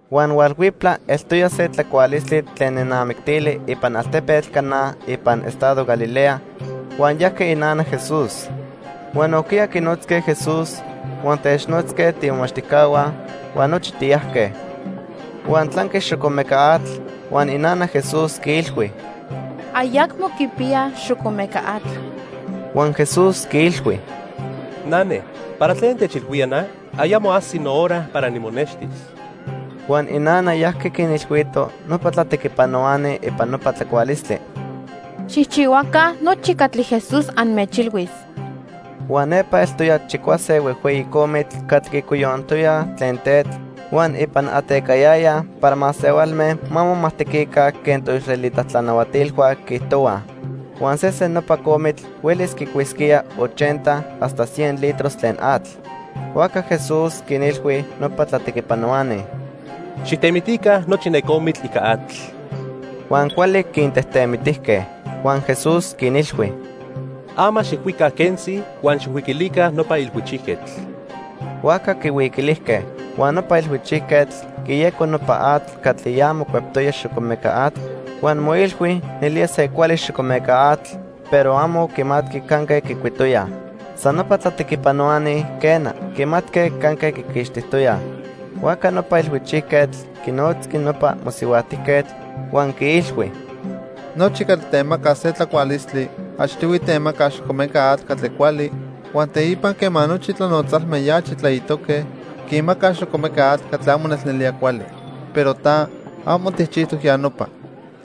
Huan hualhuiptla eltoya se tlacualistli tlen nenamictili ipan altepetl Caná ipan estado Galilea, huan yajqui inana Jesús. Huan nojquiya quinotzque Jesús huan technotzque tiimomachtijcahua, huan nochi tiyajque. Huan tlanqui xocomeca atl, huan inana Jesús quiilhui: —Ayacmo quipiyaj xocomeca atl. Huan Jesús quiilhui: —Nane, ¿para tlen techilhuía na? Ayamo ajsi nohora para nimonextis. Huan inana yajqui quinilhuito nopa tlatequipanohuani ipan nopa tlacualistli: —Xijchihuaca nochi catli Jesús anmechilhuis. Huan nepa eltoya chicuase huejhueyi comitl catli quicoyonijtoyaj tlen tetl huan ipan atecayayaj para masehualme ma momajtequica quen toisraelita tlanahuatilhua quiijtohuaj. Huan sesen nopa comitl huelis quicuisquía ochenta hasta cien litros tlen atl. Huajca Jesús quinilhui nopa tlatequipanohuani: —Xijtemitica nochi ne comitl ica atl. Huan cuali quintejtemitijque. Huan Jesús quinilhui: —Ama xijcuica quentzi huan xijhuiquilica nopa ilhuichijquetl. Huajca quihuiquilijque. Huan nopa ilhuichijquetl quiyeco nopa atl catli ya mocueptoya xocomeca atl huan moilhui nelía se cuali xocomeca atl, pero amo quimatqui canque quicuitoyaj. San nopa tlatequipanohuani, quena, quimatque canque quiquixtijtoyaj. Huajca nopa ilhuichijquetl quinotzqui nopa mosihuajtijquetl, huan quiilhui: —Nochi catli temacaj se tlacualistli achtihui temacaj xocomeca atl catli cuali, huan teipa quema nochi tlanotzalme ya achi tlaitoque, quinmacaj xocomeca atl catli amo nelnelía cuali. Pero ta, amo tijchijtoc ya nopa.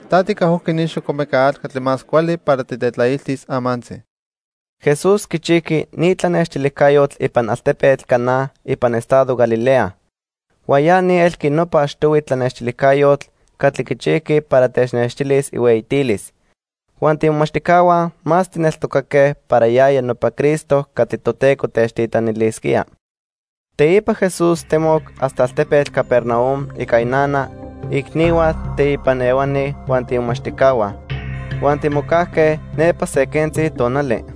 Ta ticajojqui ni xocomeca atl catli más cuali para titetlailtis amantzi. Jesús quichijqui ni tlanextilijcayotl ipan altepetl Caná ipan estado Galilea. Huan ya ni elqui nopa achtihui tlanextilijcayotl catli quichijqui para technextilis ihueyitilis. Huan tiimomachtijcahua más tijneltocaque para yaya nopa Cristo catli Toteco techtitlanilisquía. Teipa Jesús temoc hasta altepetl Capernaum ica inana, iicnihua teipan ehuani huan tiimomachtijcahua. Huan timocajque nepa se quentzi tonali.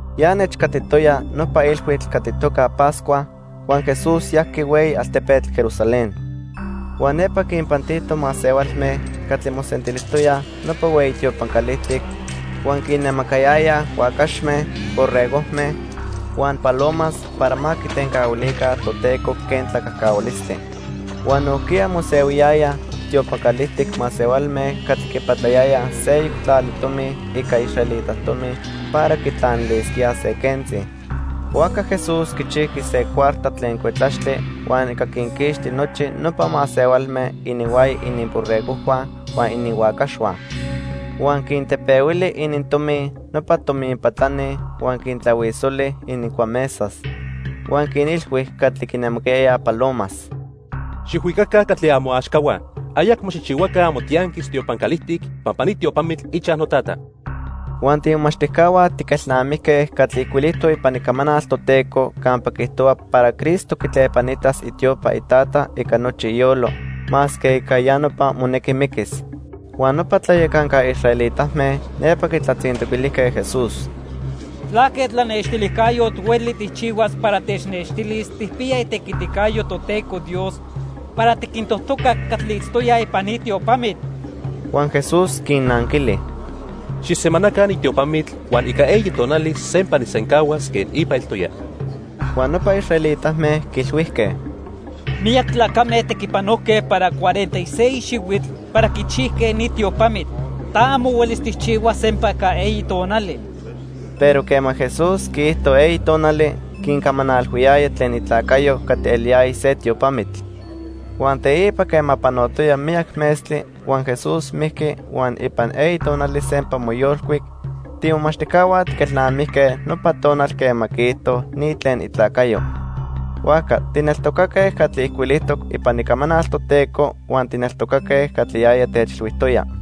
Ya nechcatitoya nopa ilhuitl catli itoca Pascua, huan Jesús yajqui hueyi altepetl Jerusalén. Huan nepa quinpantito masehualme catli mosentilijtoyaj nopa hueyi tiopan calijtic huan quinnemacayayaj huacaxme, borregojme huan palomas para ma quitencahuilica Toteco quen tlacajcahualistli. Huan nojquiya mosehuiyayaj tiopan calijtic masehualme catli quipatlayayaj seyoc tlali tomi ica israelita tomi para quitlanilisquíaj se quentzi. Huajca Jesús quichijqui se cuarta tlen cuetlaxtli huan ica quinquixti nochi nopa masehualme ininhuaya ininborregojhua huan ininhuacaxhua. Huan quintepehuili inintomi nopa tominpatlani huan quintlahuisoli inincuamesas. Huan quinilhui catli quinemacayayaj palomas: —Xijhuicaca catli amoaxcahua. Ayacmo xijchihuaca amotianquis tiopan calijtic pampa ni tiopamitl ichaj noTata. Huan tiimomachtijcahua tiquelnamijque catli ijcuilijtoc ipan Icamanal Toteco campa quiijtohua para Cristo quitlepanitas itiopa iTata ica nochi iyolo, masque ica ya nopa monequi miquis. Huan nopa tlayacanca israelitame nepa quitlatzintoquilijque Jesús: —¿Tlaque tlanextilijcayotl hueli tijchihuas para technextilis tijpiya itequiticayo Toteco Dios para tiquintojtocac catli itztoyaj ipan ni tiopamitl? Huan Jesús quinnanquili: —Xijsemanaca ni tiopamitl huan ica eyi tonali sempa nijsencahuas quen ipa eltoya. Huan nopa israelitame quiilhuijque: —Miyac tlacame tequipanojque para cuarenta y seis xihuitl para quichijque ni tiopamitl; ta amo huelis tijchihuas sempa ica eyi tonali. Pero quema Jesús quiijto eyi tonali, quincamanalhuiyaya tlen itlacayo catli eliyaya se tiopamitl. Huan teipa quema panotoya miyac metztli huan Jesús mijqui huan ipan eyi tonali sempa moyolcuic, tiimomachtijcahua tiquelnamijque nopa tonal quema quiijto ni tlen itlacayo. Huajca tijneltocaque catli ijcuilijtoc ipan Icamanal Toteco huan tijneltocaque catli yaya techilhuijtoya.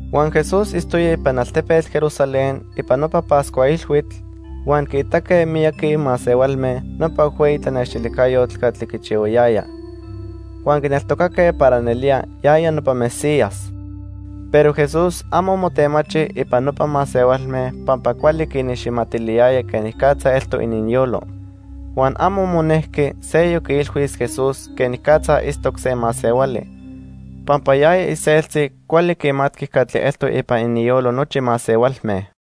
Huan Jesús itztoya ipan altepetl Jerusalén ipan nopa Pascua Ilhuitl, huan quiitaque miyaqui masehualme nopa huejhueyi tlanextilijcayotl catli quichihuayaya. Huan quineltocaque para nelía yaya nopa Mesías. Pero Jesús amo motemachi ipan nopa masehualme pampa cuali quiniximatiliyaya quenicatza eltoc ininyolo. Huan amo monejqui seyoc quiilhuis Jesús quenicatza itztoc se masehuali, pampa yaya iseltzi cuali quimatqui catli eltoc ipan ininyolo nochi masehualme.